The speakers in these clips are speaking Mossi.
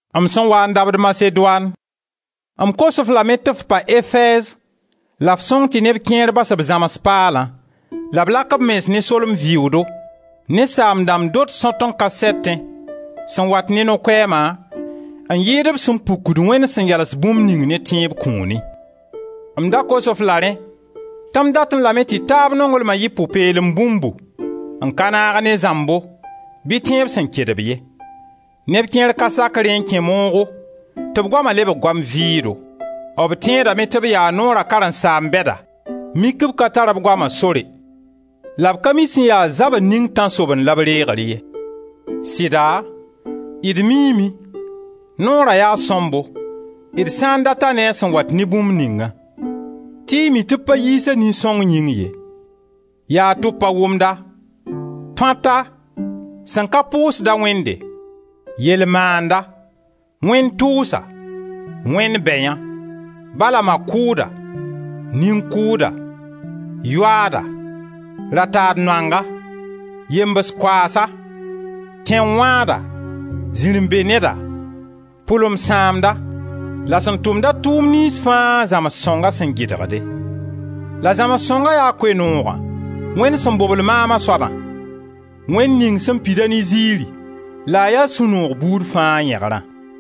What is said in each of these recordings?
M sẽn waa n dabd Masedoan, m kos-f lame tɩ f pa Efɛɛz la f sõng tɩ neb kẽer bas b zãms paala, la b lak b mens ne solem vɩʋʋdo, ne saam-dãmb dot sõt-n-ka-sɛtẽ, sẽn wat ne no-koɛɛma n yɩɩd b sẽn pukd Wẽnd sẽn yals bũmb ning ne tẽeb kũuni. M da kos-f la rẽ tɩ m datẽ lame tɩ taab nonglma yɩ pʋ-peelem bũmbu, n ka naag ne zãmbo bɩ tẽeb sẽn kedb ye. Neb kẽer ka sak rẽ n kẽ moogo, tɩ b goama lebg goam vɩʋʋdo; b tẽedame tɩ b yaa Noora karen-saamb bɛda mik b ka tar b goama sore, la b ka mi sẽn ya zabr ning tãnsobend la b reegr ye. Sɩda, d miime, Noora yaa sõmbo d sã n dat-a ne a sẽn wat ne bũmb ningã, tɩ y mi tɩ b pa yiis-a nin-sõng yĩng ye: yaa tʋb-pa-wʋmda, tõata, sẽn ka pʋʋsda Wẽnde, yel-maanda, wẽn-tʋʋsa, wẽnd bɛyã, ba la ma kʋʋda, nin-kʋʋda, yoaada, ra-taad-noanga, yembs koaasa, tẽn-wãada, zirẽ-be-neda, pʋlen-sãamda la sẽn tʋmda tʋʋm niyns fãa zãmsg sõnga sẽn gɩdgde. La zãmsg sõngã yaa Koe-noogã Wẽnd sẽn bobl maam a soabã, Wẽnd ning sẽn pida ne ziiri la a ya sũ-noog buud fãa yẽgrã.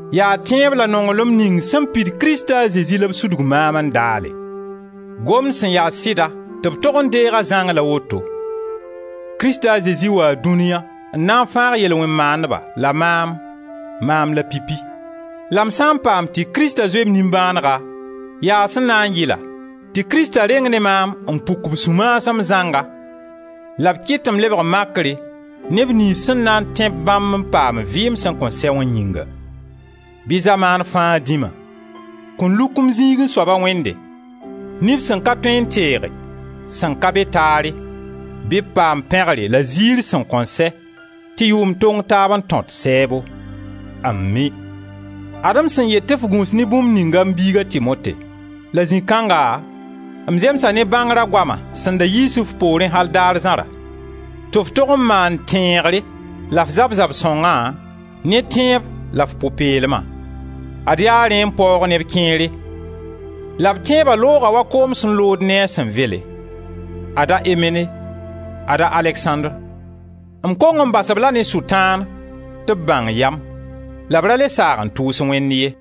Yaa tẽeb la nonglem ning sẽn pid Krista a Zezi la b sudg maam n daale. Gomd sẽn ya sɩda tɩ b tog n deeg-a zãng la woto: Krista a Zezi waa dũnia n na n fãag yel-wẽn-maandba la maam, maam la pipi. La m sã n paam tɩ Krista zoe m nimbãanega, yaa sẽn na n yɩla tɩ Krista reng ne maam n puk b sũ-maasem zãnga la b kɩt tɩ m lebg makre neb niyns sẽn na n tẽ-b bãmb n paam vɩɩm sẽn kõn sɛ wã yĩnga. Bɩ zamaan fãa Dĩma, kõn-luk-m-zĩigẽ soaba Wẽnde, nif sẽn ka tõe n teege, sẽn ka be taare, bɩ b paam pẽgre la ziir sẽn kõn sɛ, tɩ yʋʋm tong taab n tõt sɛɛbo. Ami! Ad-m sẽn yet tɩ f gũus ne bũmb ninga, m biiga Timote, la zĩ kanga m zemsa ne bãngra goama sẽn da yiis f poorẽ al daar zãra, tɩ f tog n maan tẽegre la f zab zab-sõngã, ne tẽeb la f pʋ-peelma; ad yaa rẽ n paoog neb kẽere, la b tẽeba looga wa koom sẽn lood ne a sẽn vele. Ada Imene, ada Aleksãndr. M kong n bas-b-la ne Sʋtãan tɩ b bãng yam la b ra le saag n tʋʋs Wẽnd ye.